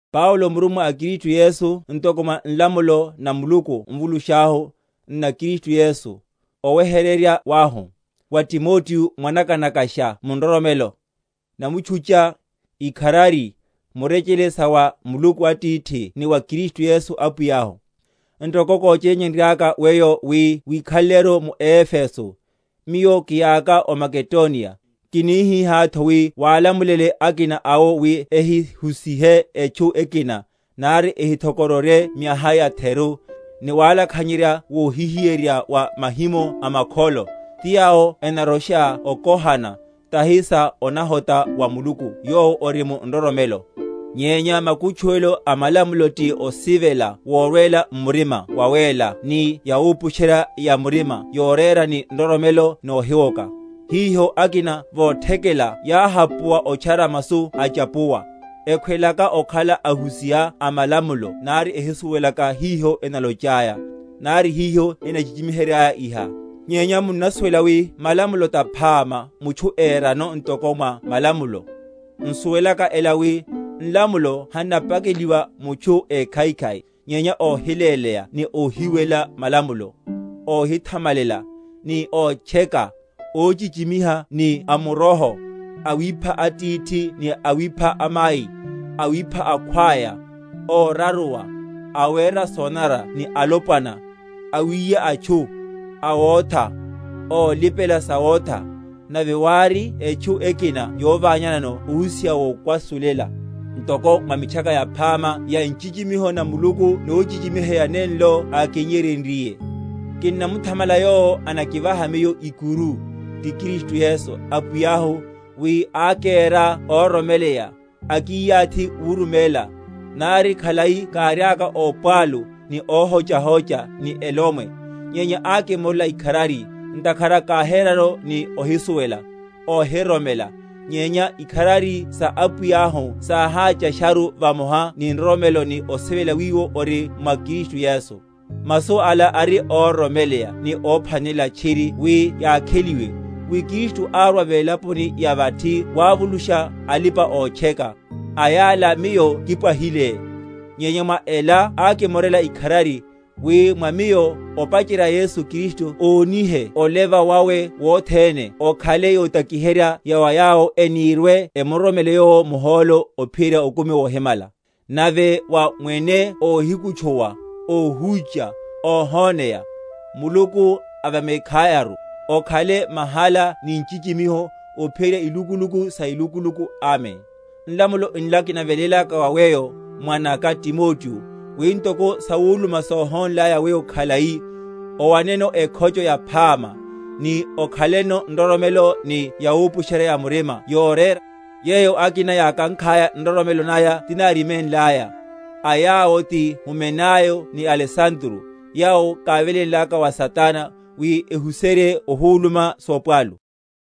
Paulo murummwa a Kristu Yesu ntoko mwa nlamulo na Muluku Mvulusháhu, nna Kristu Yesu, oweheryerya wahu: wa Timoteo mwanaka‐nakasha mu nroromelo: Namutchucha, ikharari, murechele sa wa Muluku Atithi ni wa Kristu Yesu Apwiyahu. Ntoko kóchényenryaka weyo wi wikhaleleru mu Efeso, miyo kiyaka o Makedoniya, kinihihátho, wi wálamulele akina awo wi ehihusihe etchu ekina, nari ehithokororye miaha yatheru, ni walakhanyerya wohihiyeryerya wa mahimo a makholo, ti yawo enarosha okohana, tahi sa onahota wa Muluku yowo ori mu nroromelo; nyenya makutchuwelo a malamulo ti osivela worwela m’murima wawéla ni yawupusherya‐ya‐murima yorera ni nroromelo nohiwoka; hiho, akina vothekela yáhapuwa otchara masu achapuwa; ekhweleka okhala ahusiha a malamulo nari ehisuwelaka hiho enalochaya, nari hiho enachichimiheryaya iha. Nyenya munnasuwela wi malamulo taphama, mutchu érano ntoko mwa malamulo, n’suwelaka ela wi, nlamulo hannapakeliwa mutchu ékhaikhai, nyenya óhiléleya ni óhiwelela malamulo, óhithamalela, ni ótcheka, óhichichimiha ni amuroho, awipha atithi ni awipha amai, awipha akhwaya, óraruwa, awera sonanara ni alopwana, awiya atchu, awotha, ólipela sawotha, nave wári etchu ekina yoványanano ohusiha wokwasulela; ntoko mwa Mitchaka Yaphama ya nchichimiho na Muluku nochichimiheya nenlo ákinnyeryenryiye. Kinnamuthamala Yowo anakivaha miyo ikuru, ti Kristu Yesu. Apwiyahu, wi ákera óroromeleya, akiyathi wuruméla, nari khalai káriaka ópwalu, ni óhochahocha, ni elomwe; nyenya ákimorela ikharari, ntakhara káherano ni ohisuwela, óhiroromela; nyenya ikharari sa Apwiyahu sáháchasharu vamoha ni nroromelo ni osivela wiwo ori mwa Kristu Yesu. Masu ala ari óroromeleya ni óphwanelela tchiri wi yakheliwe, wi Kristu árwa velaponi ya vathi wavulusha alipa‐otcheka; a yala miyo kipwahile; nyenya mwa ela ákimorela ikharari, wi mwa miyo, opacherya, Yesu Kristu ónihe oleva wawe wothene okhale yotakiherya ya wa yawo enirwe‐emuroromele Yowo muhólo ophiyerya okumi wohimala. Nave wa Mwene óhikutchuwa, óhúcha, óhoneya, Muluku a vamekhayaru, okhale mahala ni nchichimiho, ophiyerya ilukuluk sa ilukuluku. Amen. Nlamulo nla kinavelélaka wa weyo mwanaka Timoteo, wi, ntoko sawuluma sóhónlaya weyo khalai, owaneno ekhocho yaphama; ni okhalano nroromelo ni yawupusherya‐ya‐murima yorera, yeyo akina yákankhaya, nroromelo naya tináriménlaya; a yawo ti Humenayo ni Alesandro, yawo kávelénlaka wa Satana, wi ehuserye ohuluma sopwalu.